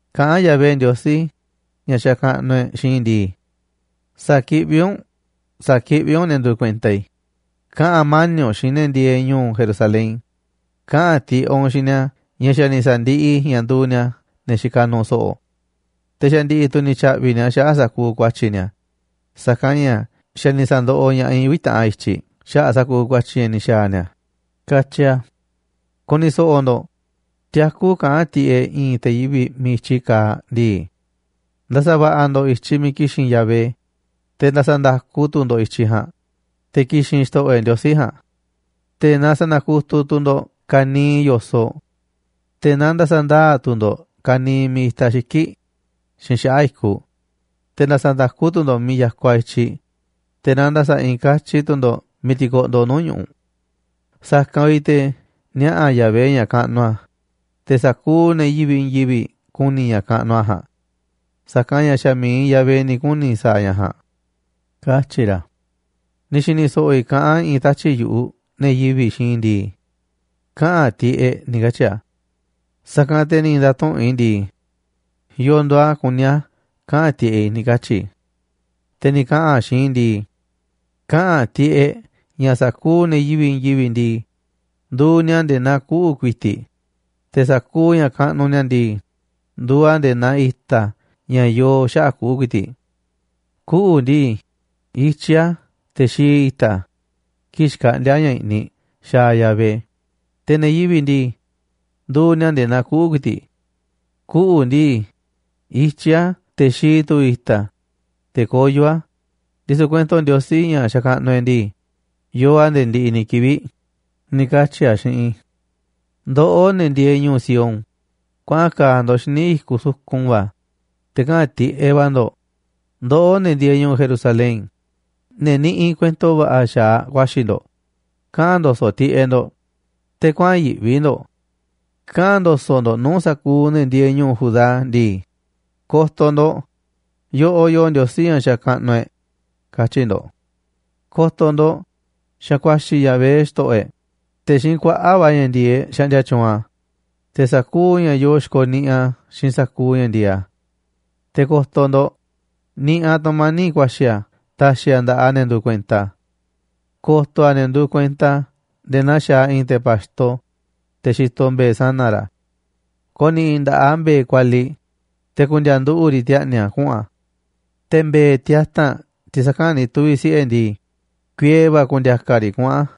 Kaꞌán Yahvé Ndiosí, ña̱ xakaꞌnuꞌ e̱ꞌ, xiinꞌ i̱ ndii: “Sa̱kiꞌví u̱nꞌ, sa̱kiꞌví u̱nꞌ ne̱ nduuꞌ kuenta i̱. Kaꞌa̱n mani̱ꞌ u̱nꞌ xiinꞌ ne̱ ndieeꞌ ñu̱u̱ Jerusalén, kaꞌa̱n tiꞌeꞌ u̱nꞌ xiinꞌ ni̱a̱ ña̱ xa̱ ni̱ sa̱ndiꞌiꞌ i̱ ña̱ nduuꞌ ni̱a̱ ne̱ xikaꞌ nuuꞌ so̱ꞌo̱. Te̱ xa̱ ndi̱ꞌi̱ tu̱ ni̱ tya̱ꞌvi̱ ni̱a̱ xaꞌa̱ꞌ sa̱kuuꞌ ku̱a̱tyi̱ ni̱a̱, sa̱kanꞌ ña̱ xa̱ ni̱ sa̱ndoꞌoꞌ ña̱ꞌaꞌ i̱ uvi̱ taꞌan i̱tyiꞌ xaꞌa̱ꞌ sa̱kuuꞌ ku̱a̱tyi̱ ña̱ ni̱ xa̱a̱ ni̱a̱”, katyi a̱. Ku̱ni̱ so̱ꞌo̱ ndo̱ꞌ, tiakú kaꞌán tiꞌeꞌ i̱i̱n te̱ yivi̱ꞌ miiꞌ i̱tyi kaaꞌ ndii: “Nda̱sa̱ va̱ꞌa̱ ndo̱ꞌ i̱tyiꞌ miiꞌ ki̱xi̱n Yahvé, te̱ nda̱sa̱ nda̱ku tu̱ ndo̱ꞌ i̱tyiꞌ ja̱a̱nꞌ, te̱ ki̱xi̱n Xto̱ꞌo̱ e̱ꞌ Ndiosí ja̱a̱nꞌ. Te̱ na sa̱na̱kutuꞌ tu̱ ndo̱ꞌ ka̱niiꞌ yo̱soꞌ, te̱ na nda̱sa̱ ndaa̱ tu̱ ndo̱ꞌ ka̱niiꞌ miiꞌ itaꞌ xiki̱ꞌ xiinꞌ xaꞌa̱ꞌ i̱kuꞌ. Te̱ na nda̱sa̱ nda̱ku tu̱ ndo̱ꞌ miiꞌ ya̱kuaꞌ i̱tyiꞌ, te̱ na nda̱sa̱ i̱i̱n katyi tu̱ ndo̱ꞌ miiꞌ tikoꞌndoꞌ nuu̱ꞌ ñu̱ꞌuꞌ. Sa̱kanꞌ vi̱ꞌ te̱ niaꞌa̱ Yahvé ña̱ kaꞌnuꞌ a̱, te̱ sa̱kuuꞌ ne̱ yivi̱ꞌ i̱i̱n yivi̱ꞌ ku̱ni̱ ña̱ kaꞌnuꞌ a̱ ja̱a̱nꞌ. Sa̱kanꞌ ña̱ xa̱ mi̱iꞌ Yahvé ni̱ kuni̱ sa̱a̱ ña̱ ja̱a̱nꞌ”, katyi̱ ra̱. Ni̱ xi̱ni̱ so̱ꞌo̱ i̱ kaꞌán i̱i̱n tatyi̱ꞌ yu̱ꞌuꞌ ne̱ yivi̱ꞌ xiinꞌ i̱ ndii: “Kaꞌa̱n tiꞌeꞌ”, ni̱ katyi̱ a̱. Sa̱kanꞌ te̱ ni̱ nda̱tuꞌu̱nꞌ i̱ ndii: “¿Yo̱o̱ nduuꞌ a̱ kuní a̱ kaꞌa̱n tiꞌeꞌ i̱?”, ni̱ katyi̱ i̱. Te̱ ni̱ kaꞌa̱n a̱ xiinꞌ i̱ ndii: “Kaꞌa̱n tiꞌeꞌ ña̱ sa̱kuuꞌ ne̱ yivi̱ꞌ i̱i̱n yivi̱ꞌ ndii, nduuꞌ ni̱a̱ nde̱e̱ naa kuꞌu̱ ku̱i̱ti̱ꞌ, te̱ sa̱kuuꞌ ña̱ kaꞌnuꞌ ni̱a̱ ndii, nduuꞌ a̱ nde̱e̱ naa i̱ta̱ ña̱ yoo xaꞌa̱ꞌ kuꞌu̱ ku̱i̱ti̱ꞌ. Kuꞌu̱ ndii, ityí a̱ te̱ xii i̱ta̱ a̱ kii̱ꞌ xkaꞌndíá ña̱ i̱ꞌniꞌ xaaꞌ Yahvé, te̱ ne̱ yivi̱ꞌ ndii, nduuꞌ ni̱a̱ nde̱e̱ naa kuꞌu̱ ku̱i̱ti̱ꞌ. Kuꞌu̱ ndii, ityí a̱ te̱ xii tu̱ i̱ta̱ a̱, te̱ koyó a̱, ndisu̱ kuento Ndiosí, ña̱ xakaꞌnuꞌ e̱ꞌ ndii, yoo a̱ nde̱e̱ ndiꞌiꞌ ni̱ kivi̱ꞌ”, ni̱ katyi̱ a̱ xiinꞌ i̱. Ndoꞌó, ne̱ ndieeꞌ ñu̱u̱ Sión, kuaꞌan ka̱a̱ ndo̱ꞌ xíniꞌ i̱kuꞌ sukun va̱, te̱ kaꞌa̱n tiꞌeꞌ va̱ ndo̱ꞌ. Ndoꞌó, ne̱ ndieeꞌ ñu̱u̱ Jerusalén, ne̱ niꞌiꞌ kuento va̱ꞌa̱ xa̱aꞌ ku̱a̱xi̱ ndo̱ꞌ, kaꞌa̱n ndo̱so̱ꞌ tiꞌeꞌ ndo̱ꞌ, te̱ kuäa̱n yi̱ꞌvi ndo̱ꞌ. Kaꞌa̱n ndo̱so̱ꞌ ndo̱ꞌ nuu̱ꞌ sa̱kuuꞌ ne̱ ndieeꞌ ñu̱u̱ Judá ndii: “Ko̱to̱ ndo̱ꞌ, yoꞌoꞌ yoo Ndiosí ña̱ xakaꞌnuꞌ e̱ꞌ”, katyi̱ ndo̱ꞌ. Ko̱to̱ ndo̱ꞌ, xa̱ ku̱a̱xi̱ Yahvé xto̱ꞌo̱ e̱ꞌ, te̱ xiinꞌ kuaꞌa̱ꞌ va̱ ña̱ ndi̱e̱eꞌ xaꞌndia tyuunꞌ a̱, te̱ sa̱kuuꞌ ña̱ yoo xikoniꞌiꞌ a̱ xiinꞌ sa̱kuuꞌ ña̱ ndi̱e̱eꞌ a̱. Te̱ ko̱to̱ ndo̱ꞌ, niꞌiꞌ a̱ tu̱mani̱ꞌ ku̱a̱xi̱ a̱ ta̱xi̱ a̱ nda̱ꞌaꞌ ne̱ nduuꞌ kuenta a̱. Ko̱to̱ a̱ ne̱ nduuꞌ kuenta a̱ nde̱e̱ naa xaaꞌ i̱i̱n te̱ pa̱xto, te̱ xitoꞌ mbe̱e̱ sana̱ ra̱. Ko̱ni̱ꞌi̱ nda̱ꞌaꞌ a̱ mbe̱e̱ kualiꞌ, te̱ ku̱ndi̱a̱a̱ nduꞌu̱ꞌ riꞌ ti̱a̱ꞌni̱ a̱ kuꞌu̱n a̱. Te̱ mbe̱e̱ tiata̱nꞌ tiꞌ saka̱nꞌ ni̱ tuvi̱ siꞌe̱ ndii, kuiee va̱ ku̱ndi̱a̱kaꞌ a̱ riꞌ kuꞌu̱n a̱.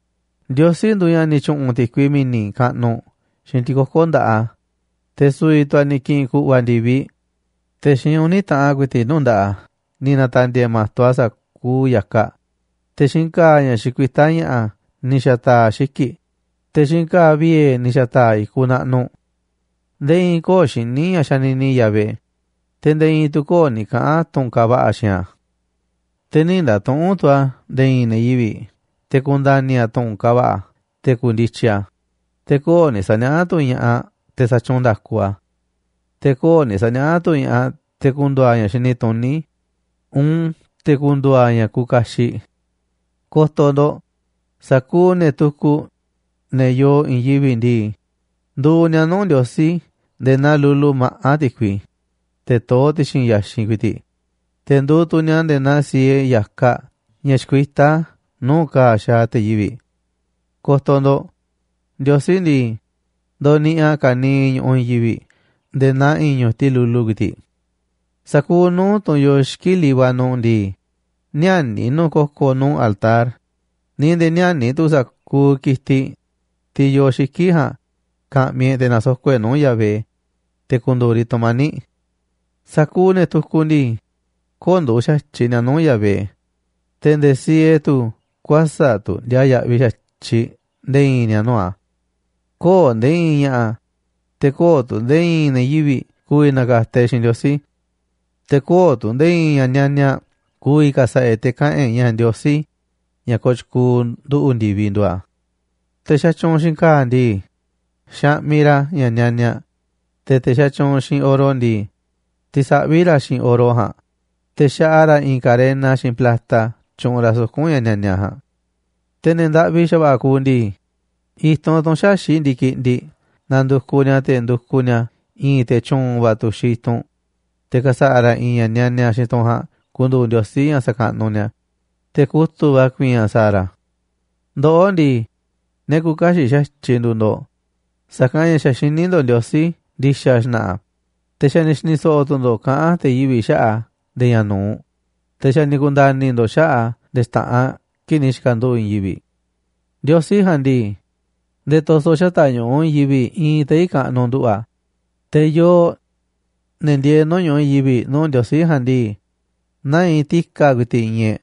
Ndiosí nduuꞌ ña̱ ni̱ tyu̱ꞌu̱n ti̱kui mi̱ni̱ kaꞌnuꞌ xiinꞌ ti̱koko̱ nda̱ꞌaꞌ a̱, te̱ su̱vi̱ tu̱ a̱ ni̱ ki̱ꞌi̱n ku̱ꞌva̱ ndi̱viꞌ, te̱ xiinꞌ uni̱ taꞌan ku̱i̱ti̱ꞌ nuu̱ꞌ nda̱ꞌaꞌ a̱ ni̱ na̱ta̱ndi̱e̱e̱ ma̱to a̱ sa̱kuuꞌ ya̱kaꞌ, te̱ xiinꞌ ka̱a̱ ña̱ xikuitá ña̱ꞌa̱ ni̱ xa̱ta̱a̱ a̱ xiki̱ꞌ, te̱ xiinꞌ ka̱a̱ viee̱ ni̱ xa̱ta̱a̱ a̱ i̱kuꞌ naꞌnuꞌ. Nde̱e̱ i̱i̱n köo̱ꞌ xiní ña̱ xanini Yahvé, te̱ nde̱e̱ i̱i̱n tu̱ köo̱ꞌ ni̱ kaꞌa̱n tu̱n kaaꞌ va̱ꞌa̱ xiinꞌ a̱. Te̱ nï̱ nda̱tuꞌu̱nꞌ tu̱ a̱ nde̱e̱ i̱i̱n ne̱ yivi̱ꞌ te̱ ku̱nda̱ni̱ a̱ tu̱ꞌu̱n kaaꞌ va̱ꞌa̱ te̱ ku̱ndityi a̱, te̱ köo̱ꞌ ni̱ sa̱niaꞌá tu̱ ña̱ꞌaꞌ te̱ sa̱tyuunꞌ nda̱ku a̱. Te̱ köo̱ꞌ ni̱ sa̱niaꞌá tu̱ ña̱ꞌaꞌ te̱ ku̱ndu̱u̱ a̱ ña̱ xini tuní uun te̱ ku̱ndu̱u̱ a̱ ña̱ kuuꞌ kaxiꞌ. Ko̱to̱ ndo̱ꞌ, sa̱kuuꞌ ne̱ tukuꞌ, ne̱ yoo i̱i̱n yivi̱ꞌ ndii, nduuꞌ ni̱a̱ nuu̱ꞌ Ndiosí nde̱e̱ naa lulu maꞌá ti̱kui, teꞌ toó ti̱xi̱n ya̱xinꞌ ku̱i̱ti̱ꞌ. Te̱ nduuꞌ tu̱ ni̱a̱ nde̱e̱ naa siee ya̱kaꞌ ña̱ xkuitá nuu̱ꞌ ka̱a̱ xaaꞌ te̱ yivi̱ꞌ. Ko̱to̱ ndo̱ꞌ, Ndiosí ndii, ndoniꞌiꞌ a̱ ka̱niiꞌ ñu̱ꞌuꞌ i̱i̱n yivi̱ꞌ nde̱e̱ naa i̱i̱n ñu̱tiꞌ lulu ku̱i̱ti̱ꞌ. Sa̱kuuꞌ nuu̱ꞌ tunꞌ yoo xiki̱ꞌ Líbano ndii, ni̱ä̱ni̱ nu̱ꞌ ko̱ko̱ nuu̱ꞌ altar, ni̱ nde̱e̱ ni̱ä̱ni̱ tu̱ sa̱kuuꞌ ki̱tiꞌ, tiꞌ yoo xiki̱ꞌ ja̱a̱nꞌ, ka̱ꞌmi̱ e̱ꞌ te̱ na̱soko̱ꞌ e̱ꞌ nuu̱ꞌ Yahvé, te̱ ku̱ndu̱u̱ riꞌ tu̱mani̱ꞌ. Sa̱kuuꞌ ne̱ tukuꞌ ndii, köo̱ꞌ nduuꞌ xa̱tyiꞌ ni̱a̱ nuu̱ꞌ Yahvé, te̱ nde̱e̱ siee tu̱ kuäsa̱ꞌ tu̱ ndiaa yaꞌviꞌ xa̱tyiꞌ nde̱e̱ i̱i̱n ni̱a̱ nuu̱ꞌ a̱. Köo̱ꞌ nde̱e̱ i̱i̱n ña̱ꞌa̱, te̱ köo̱ꞌ tu̱ nde̱e̱ i̱i̱n ne̱ yivi̱ꞌ ku̱vi̱ na̱ka̱ta̱ e̱ꞌ xiinꞌ Ndiosí. Te̱ köo̱ꞌ tu̱ nde̱e̱ i̱i̱n ña̱ nianiaꞌ ku̱vi̱ ka̱sa̱ꞌa̱ e̱ꞌ te̱ kaꞌa̱n e̱ꞌ ña̱ Ndiosí, ña̱ kooꞌ tyukuuꞌ nduꞌu̱ꞌ ndi̱vi, nduuꞌ a̱. Te̱ xatyuunꞌ xiinꞌ ka̱a̱ ndii, xaꞌmiꞌ ra̱ ña̱ nianiaꞌ, te̱ te̱ xatyuunꞌ xiinꞌ oro ndii, tisaꞌví ra̱ a̱ xiinꞌ oro ja̱a̱nꞌ, te̱ xaꞌa ra̱ i̱i̱n karena xiinꞌ plata tyuꞌunꞌ ra̱ suku̱nꞌ ña̱ nianiaꞌ ja̱a̱nꞌ. Te̱ ne̱ ndaꞌvi xa̱va̱ꞌa̱ kuuꞌ ndii, i̱tunꞌ, tunꞌ xäxi̱ꞌ ndi̱kiꞌndiꞌ, nandukuꞌ ni̱a̱, te̱ ndukuꞌ ni̱a̱ i̱i̱n te̱ tyu̱u̱n va̱ tuxiꞌ i̱tunꞌ, te̱ ka̱sa̱ꞌa̱ ra̱ i̱i̱n ña̱ nianiaꞌ xiinꞌ tunꞌ ja̱a̱nꞌ ku̱ndu̱u̱ ndiosí ña̱ sa̱kaꞌnuꞌ ni̱a̱, te̱ kutu̱ꞌ va̱ ku̱i̱i̱n a̱ sa̱a̱ ra̱. Ndoꞌó ndii, ne̱ küuꞌ kaxiꞌ xa̱tyiꞌ nduuꞌ ndo̱ꞌ, sa̱kanꞌ ña̱ xa̱ xiní ndo̱ꞌ Ndiosí ndi̱xa̱ xna̱ꞌa̱, te̱ xa̱ ni̱ xi̱ni̱ so̱ꞌo̱ tu̱ ndo̱ꞌ kaꞌán te̱ yivi̱ꞌ xaꞌa̱ꞌ a̱ nde̱e̱ ña̱ nu̱uꞌ, te̱ xa̱ ni̱ ku̱nda̱ni̱ ndo̱ꞌ xaꞌa̱ꞌ a̱ nde̱e̱ xta̱ꞌanꞌ kii̱ꞌ ni̱ xi̱ka̱nduꞌu̱ꞌ i̱i̱n yivi̱ꞌ. Ndiosí ja̱a̱nꞌ ndii, nde̱e̱ to̱so̱ xata̱ꞌ ñu̱ꞌuꞌ i̱i̱n yivi̱ꞌ iinꞌ tei̱ kaꞌnuꞌ nduꞌu̱ꞌ a̱. Te̱ yooꞌ, ne̱ ndieeꞌ nuu̱ꞌ ñu̱ꞌuꞌ i̱i̱n yivi̱ꞌ nuu̱ꞌ Ndiosí ja̱a̱nꞌ ndii, naa iinꞌ ti̱ka̱ ku̱i̱ti̱ꞌ iinꞌ e̱ꞌ.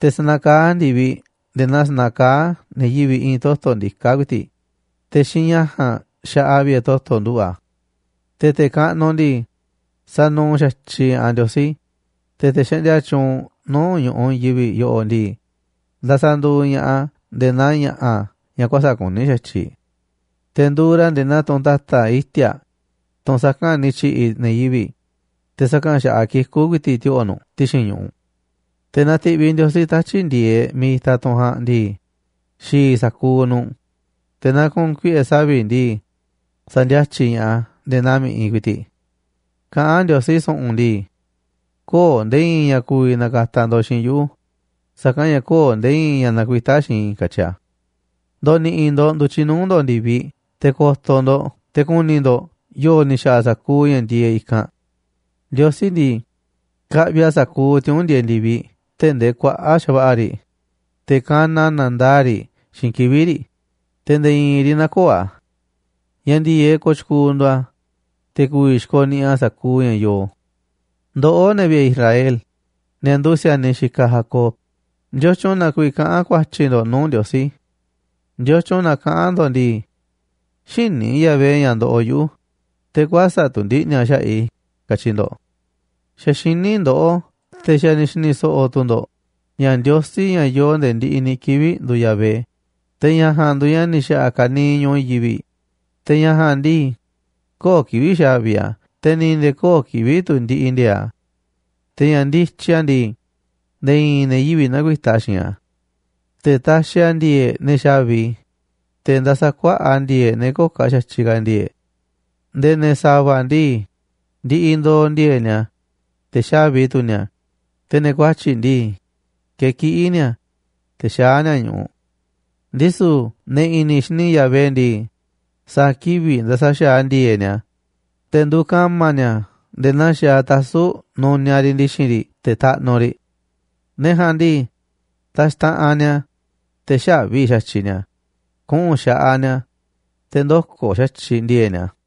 Te̱ sanakaá a̱ ndi̱viꞌ nde̱e̱ naa sanakaá ne̱ yivi̱ꞌ i̱i̱n toto̱ ndiká ku̱i̱ti̱ꞌ, te̱ xiinꞌ ña̱ ja̱a̱nꞌ xaꞌa a̱ vi̱ꞌe̱ toto̱ nduꞌu̱ꞌ a̱. Te̱ te̱ kaꞌnuꞌ ndii, sanuuꞌ xa̱tyiꞌ ña̱ꞌaꞌ Ndiosí, te̱ te̱ xaꞌndia tyuunꞌ nuu̱ꞌ ñu̱ꞌuꞌ i̱i̱n yivi̱ꞌ yoꞌoꞌ ndii, ndasaꞌ nduuꞌ ña̱ꞌaꞌ a̱ nde̱e̱ naa ña̱ꞌa̱ ña̱ kuäsa̱ꞌ kuní xa̱tyiꞌ. Te̱ nduuꞌ ra̱ nde̱e̱ naa tunꞌ ta̱ta̱ iti̱a̱ꞌ, tunꞌ saka̱nꞌ ni̱ tyi̱ꞌi̱ ne̱ yivi̱ꞌ, te̱ saka̱nꞌ xa̱ꞌaꞌ kikú ku̱i̱ti̱ꞌ tu̱ ti̱o̱ꞌo̱ nu̱ꞌ ti̱xi̱n ñu̱ꞌuꞌ. Te̱ naaꞌ ti̱ꞌviꞌ Ndiosí tatyi̱ꞌ ndi̱e̱eꞌ miiꞌ itaꞌ tunꞌ ja̱a̱nꞌ ndii, xi̱i̱ sa̱kuuꞌ nu̱ꞌ, te̱ naaꞌ ku̱u̱n kuiꞌe̱ savi̱ꞌ ndii, sa̱ndi̱a̱tyiꞌ ña̱ꞌaꞌ a̱ nde̱e̱ naa mi̱ꞌiꞌ ku̱i̱ti̱ꞌ. Kaꞌán Ndiosí su̱ꞌu̱n ndii: “Köo̱ꞌ nde̱e̱ i̱i̱n ña̱ ku̱vi̱ na̱ka̱ta̱ ndo̱ꞌ xiinꞌ yuꞌu̱, sa̱kanꞌ ña̱ köo̱ꞌ nde̱e̱ i̱i̱n ña̱ nakuitá xiinꞌ i̱”, katyi a̱. Ndo̱ni̱ꞌi̱ ndo̱ꞌ ndu̱tyiꞌ nuu̱ꞌ ndo̱ꞌ ndi̱viꞌ te̱ ko̱to̱ ndo̱ꞌ te̱ ku̱ni̱ ndo̱ꞌ yo̱o̱ ni̱ xa̱ꞌa̱ sa̱kuuꞌ ña̱ ndieeꞌ i̱kanꞌ. Ndiosí ndii, kaꞌviꞌ a̱ sa̱kuuꞌ tiuu̱nꞌ ndieeꞌ ndi̱viꞌ tee̱ꞌ ndee kuaꞌa̱ꞌ xa̱va̱ꞌa̱ riꞌ, te̱ kanaꞌ a̱ na̱ndaa̱ꞌ riꞌ xiinꞌ kivi̱ꞌ riꞌ, te̱ nde̱e̱ i̱i̱n riꞌ nä̱ko̱o̱ a̱. Ña̱ ndi̱e̱eꞌ kooꞌ tyukuuꞌ nduuꞌ a̱, te̱ ku̱vi̱ xikoniꞌiꞌ a̱ sa̱kuuꞌ ña̱ yoo. Ndoꞌó, ne̱ vi̱ꞌe̱ Israel, ne̱ nduuꞌ si̱a̱niꞌ xikaꞌ Jacob, ¿ndiotyun na kuiiꞌ kaꞌán ku̱a̱tyi̱ ndo̱ꞌ nuu̱ꞌ Ndiosí? ¿Ndiotyun na kaꞌán ndo̱ꞌ ndii: “Xïní Yahvé ña̱ ndoꞌoꞌ yuꞌu̱, te̱ kuäsa̱ꞌ tu̱ ndiꞌni̱ a̱ xaꞌa̱ꞌ i̱?”, katyi ndo̱ꞌ. Xa̱ xiní ndoꞌó, te̱ xa̱ ni̱ xi̱ni̱ so̱ꞌo̱ tu̱ ndo̱ꞌ ña̱ Ndiosí, ña̱ yoo nde̱e̱ ndiꞌiꞌ ni̱ kivi̱ꞌ, nduuꞌ Yahvé. Te̱ ña̱ ja̱a̱nꞌ nduuꞌ ña̱ ni̱ xa̱ꞌa̱ ka̱niiꞌ ñu̱ꞌuꞌ i̱i̱n yivi̱ꞌ, te̱ ña̱ ja̱a̱nꞌ ndii, köo̱ꞌ kivi̱ꞌ xáviꞌ a̱, te̱ ni̱ nde̱e̱ köo̱ꞌ kivi̱ꞌ tu̱ ndiꞌiꞌ ndi̱e̱e̱ꞌ a̱. Te̱ ña̱ ndityi a̱ ndii, nde̱e̱ i̱i̱n ne̱ yivi̱ꞌ näkuitá xiinꞌ a̱. Te̱ taxiꞌ a̱ ndi̱e̱e̱ꞌ ne̱ xa̱vi, te̱ ndasaꞌ kuaꞌa̱ꞌ a̱ ndi̱e̱e̱ꞌ ne̱ köo̱ꞌ xa̱tyiꞌ ka̱ ndi̱e̱e̱ꞌ. Nde̱e̱ ne̱ sa̱va̱ ndii, ndiꞌiꞌ ndo̱o̱ ndi̱e̱e̱ꞌ ni̱a̱, te̱ xáviꞌ tu̱ ni̱a̱, te̱ ne̱ kuatyi̱ꞌ ndii, kekiꞌí ni̱a̱, te̱ xaá ni̱a̱ ñu̱ꞌuꞌ. Ndisu̱ ne̱ i̱ni̱ xini Yahvé ndii, sa̱a̱ kivi̱ꞌ nda̱sa̱ xa̱aꞌ a̱ ndi̱e̱e̱ꞌ ni̱a̱, te̱ nduuꞌ ka̱ma̱ ni̱a̱ nde̱e̱ naa xaaꞌ tasu̱ꞌ nuniaꞌ riꞌ ndi̱xi̱n riꞌ te̱ taꞌnuꞌ riꞌ. Ne̱ ja̱a̱nꞌ ndii, ta̱xtaꞌanꞌ ni̱a̱, te̱ xä̱vi xa̱tyiꞌ ni̱a̱ kuꞌu̱n xaꞌaꞌ ni̱a̱, te̱ ndö̱ko̱ xa̱tyiꞌ ndi̱e̱e̱ꞌ ni̱a̱.